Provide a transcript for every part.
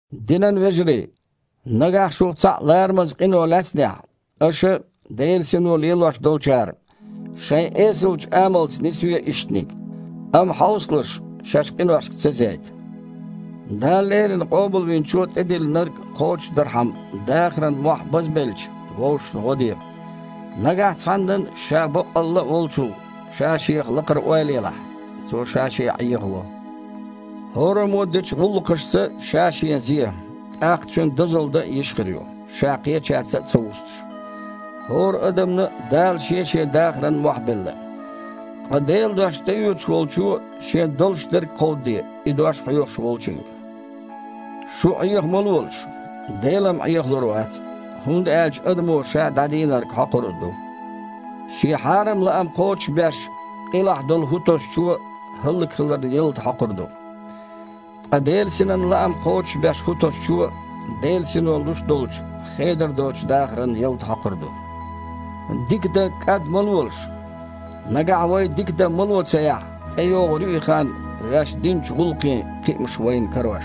Динан вежарий! Нагахь шух цхьаъ ларамаза къино лаьцнехь, аша, Делан Сино лелош долчара, шайн эсалчу амалца нисве иштаниг, амма, хьовсалаш, шаьш къиношка ца зейта. Дала леррина Къобалвинчо тІедиллинарг кхочушдархьама, дахаран мохь базбелча, вовшашна гІо де. Нагахь цхьаннан, ша баккъалла а волчул, ша-шех лакхара ойла елахь, цо ша-шен Іехаво. ХІораммо а дечу гІуллакхашца ша-шен зе, тІаккха цуьнан дозалла дан а йиш хир ю, ша кхечаьрца а ца вустуш. ХІора адамна а Дала шен-шен дахаран мохь белла. Ткъа Делан дош тІеоьцуш волчо шен долуш дерг кховдаде и дош хьоьхуш волчуьнга. Шу Іеха ма лолаш! Дела-м Іехалур вац, хІунда аьлча адамо ша дІадийнарг хьокхур а ду. Шен хьарам лаам кхочушбеш, къилахь долу хІу тосучо хІаллакьхиларан ялта хьокхур ду. Ткъа Делан Синан лаам кхочушбеш хІу тосучо, Делан Сино луш долчу, хедар доцучу дахаран ялта хьокхур ду. Дика дан кІад ма лолаш. Нагахь вай дика дан мало ца яхь, тІейогІур ю и хан, ваьш динчу гІуллакхийн кхиамаш вайна карош.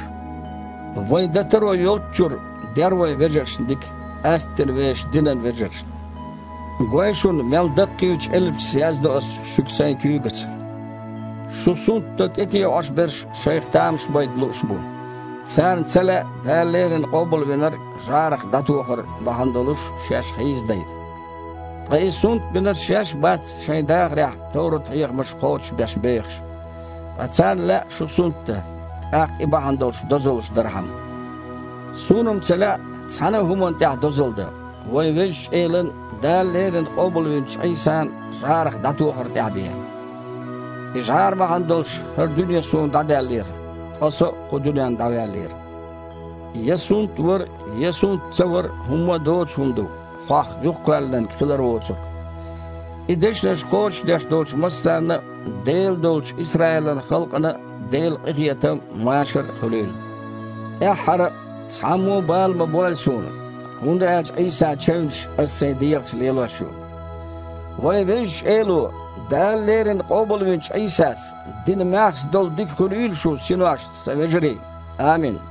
Вайн дан таро йолччуьра, дер вай вежаршна дика, къаьсттина вешан динан вежаршна. Гой шуна мел даккхийчу элпашца яздо ас шуьга сайн куьйгаца?! Шу сунтдан тІетеІош берш шайх тамаш байта лууш бу. Царна ца лаьа Дала леррина Къобалвинарг жІарах дІатохар бахьана долуш шаьш хьийзадайта. Ткъа и сунтбинарш шаьш а бац шайн дахарехь товрат-хьехамаш кхочушбеш бехаш. Ткъа царна лаьа шу сунтдан, тІаккха и бахьана долуш дозаллаш дархьама. Суна-м ца лаьа цхьана а хІуманна тІехь дозалла дан, вайн Везачу Элан, Дала леррина къобалвинчу Іийсан, жІарах дІатохаран тІехь бен! И жІара бахьана долуш хІара дуьне суна дІадаьллера, ткъа со а кху дуьненна дІаваьллера. Я сунтвар а, я сунт ца вар а хІумма а доцу хІума ду, хьох юхакхоьллинарг хилар воцург! И дешнаш кхочушдеш долчу массарна а, Делан долчу Исраилан халкъана а Делан къинхетам а, машар а хуьлийла. ТІаьххьара а: цхьаммо а бала ма бойла суна, хІунда аьлча Іийсан чевнаш аса сайн дегІаца лелош ю. Вайн Везачу Эло, Дала леррина къобалвинчу Іийсас, дина маьхза долу дика хуьлийла шун синошца, сан вежарий. Амин.